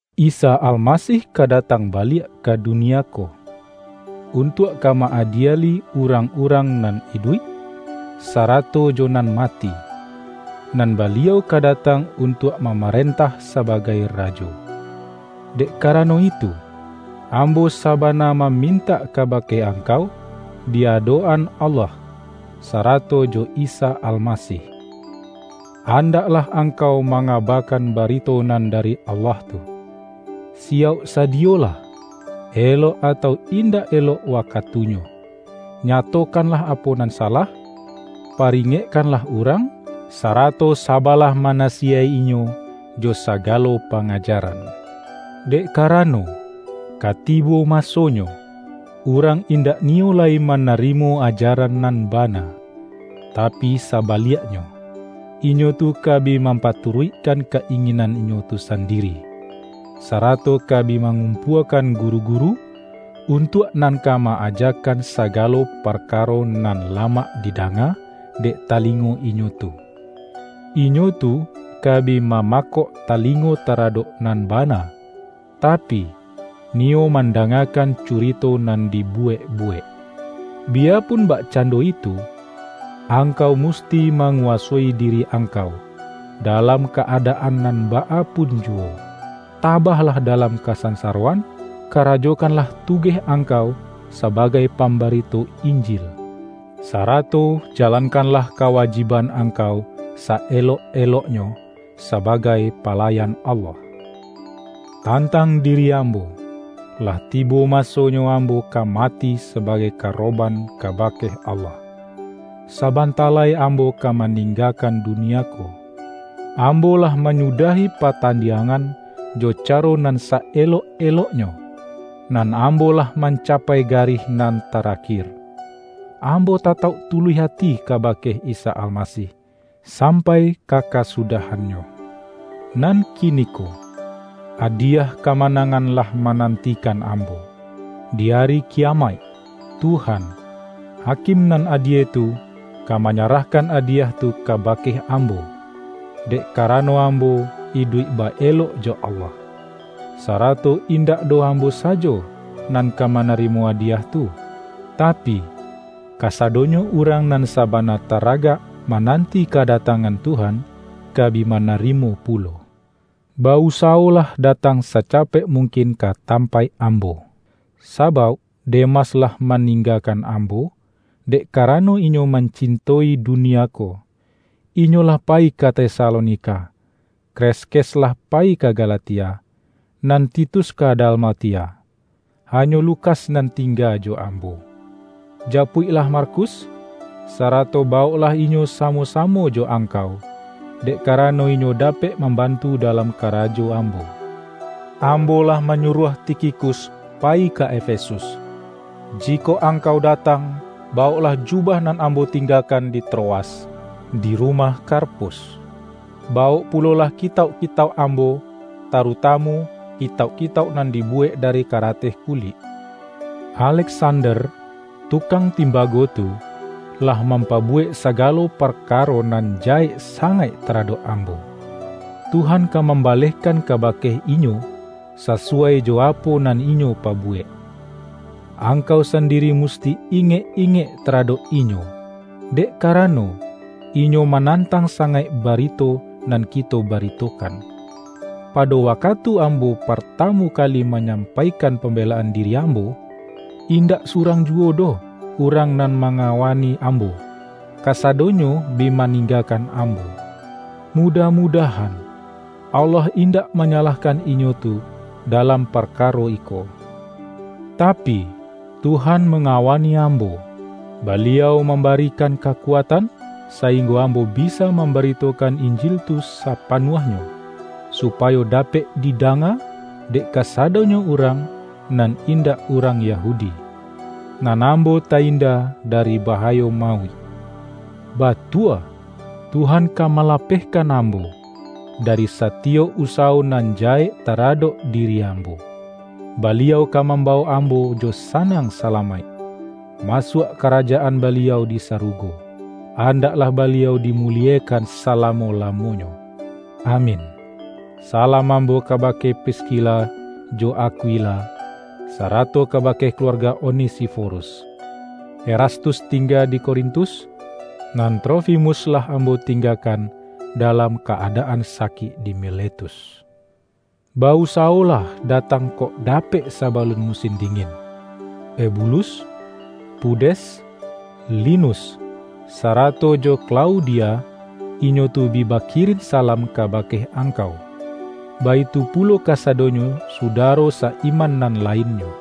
Isa Almasih ka datang baliak ka dunia ko, untuak ka ma-adieli urang-urang nan iduik, sarato jo nan mati; nan Baliau ka datang untuak mamarentah sabagai Rajo. Dek kara-no itu, ambo sabana mamintak kabake angkau di adok-an Allah, sarato jo Isa Almasih: Andaklah angkau manga-bakan barito nan dari Allah tu, siyauk sadiyolah, elok atau indak elok waka-tunyo, nyatokanlah apo nan salah, pa-ringekkanlah urang, sarato saba-lah manasiyaik-inyo jo sagalo pangaja-ran. Dek karano, ka tibo masonyo, urang indak niyo lai manarimo aja-ran nan bana. Tapi sabaliaknyo, inyo tu ka bi mampaturuikkan ka-inginan inyo tu sandiri, sarato ka bi mangum-puakan guru-guru, untuak nan ka ma-ajakan sagalo parkaro nan lamak di-danga dek talingo inyo tu. Inyo tu ka bi mamakok talingo taradok nan bana, tapi, niyo mandangakan curito nan dibuwek-buwek. Biyapun bak-cando itu, angkau musti manguwasoi diri angkau, dalam ka-adaan nan baa pun juwo. Tabahlah dalam kasansaroan, karajokanlah tugeh angkau saba-gai pambarito Injil, sarato jalankanlah kawajiban angkau sa-elok-eloknyo, sabagai palayan Allah. Tantang diri ambo, lah tibo masonyo ambo ka mati sabagai karoban kabake Allah. Saban-ta lai ambo ka maninggakan dunia ko. Ambo lah manyudahi patandiangan jo caro nan sa-elok-eloknyo, nan ambo lah mancapai garih nan tarakir. Ambo tatauk tuluih ati kabake Isa Almasih sampai ka kasudahannyo. Nan kini-ko, adiyah kamanangan lah mananti-kan ambo. Di Ari Kiyamaik, Tuhan, Hakim nan adie tu, ka manyarahkan adiyah tu kabake ambo, dek karano ambo iduik ba-elok jo Allah. Sarato in-dak doh ambo sajo nan ka manarimo adiyah tu, tapi, kasadonyo urang nan sabana taragak mananti kadatangan Tuhan, ka bi manarimo pulo. Ba-usawolah datang sacapek mung-kin ka tampaik ambo, sabauk De-mas lah maninggakan ambo, dek ka-rano inyo mancinto-i dunia ko. Inyo lah payi ka Tesalonika. Kreskes lah pa-yi ka Galatia, nan Titus ka Dalmatia. Hanyo Lukas nan tingga jo ambo. Japuiklah Markus, sarato bawoklah inyo samo-samo jo angkau, dek kara-no inyo dapek mambantu dalam kara-jo ambo. Ambo lah manyuruah Ti-khikus payi ka Efesus. Jikok angkau datang, bawoklah jubah nan ambo tinggakan di Troas, di rumah Karpus. Bawok pulolah kitauk-kitauk ambo, tarutamu kitauk-kitauk nan dibuwek dari karateh kulik. Aleksander, tukang timbago tu, lah mampabuwek sagalo parkaro nan jahek sangaik taradok ambo. Tuhan ka mambalehkan kabake inyo, sa-suwai jo apo nan inyo pabuwek. Angkau sandiri musti ingek-ingek taradok inyo, dek karano, inyo ma-nantang sangaik barito nan kito ba-ritokan. Pado wakatu ambo partamu kali manyampaikan pambelaan diri ambo, indak surang juwo doh urang nan ma-ngawani ambo; kasadonyo bi maning-gakan ambo. Mudah-mudahan, Allah indak manyalahkan inyo tu dalam parkaro iko! Tapi, Tuhan manga-wani ambo. Baliau mambarikan ka-kuatan, sainggo ambo bisa mamba-ritokan Injil tu sapanuahnyo, supayo dapek didanga, dek kasadonyo urang nan indak urang Yahudi. Nan ambo ta-inda dari bahayo mauik. Batua, Tuhan ka malapehkan ambo, dari sa-tiyok usawo nan jahek taradok di-ri ambo. Baliau ka mambawok ambo jo sanang salamaik, masuak Karajaan Baliau di sarugo. Andaklah Baliau di-muliekan salamo-lamonyo! Amin! Salam ambo kabake Priskila jo Ak-wila, sarato kabake kaluarga Onesifo-rus. Erastus tingga di Korintus, nan Trofimus lah ambo tinggakan dalam ka-adaan sakik di Miletus. Ba-usawo-lah datang kok dapek sabalun musin di-ngin. Ebulus, Pudes, Linus, sarato jo Klau-dia, inyo tu bi bakirin salam kabake angkau; baitu pulo kasadonyo sudaro sa-iman nan lainnyo.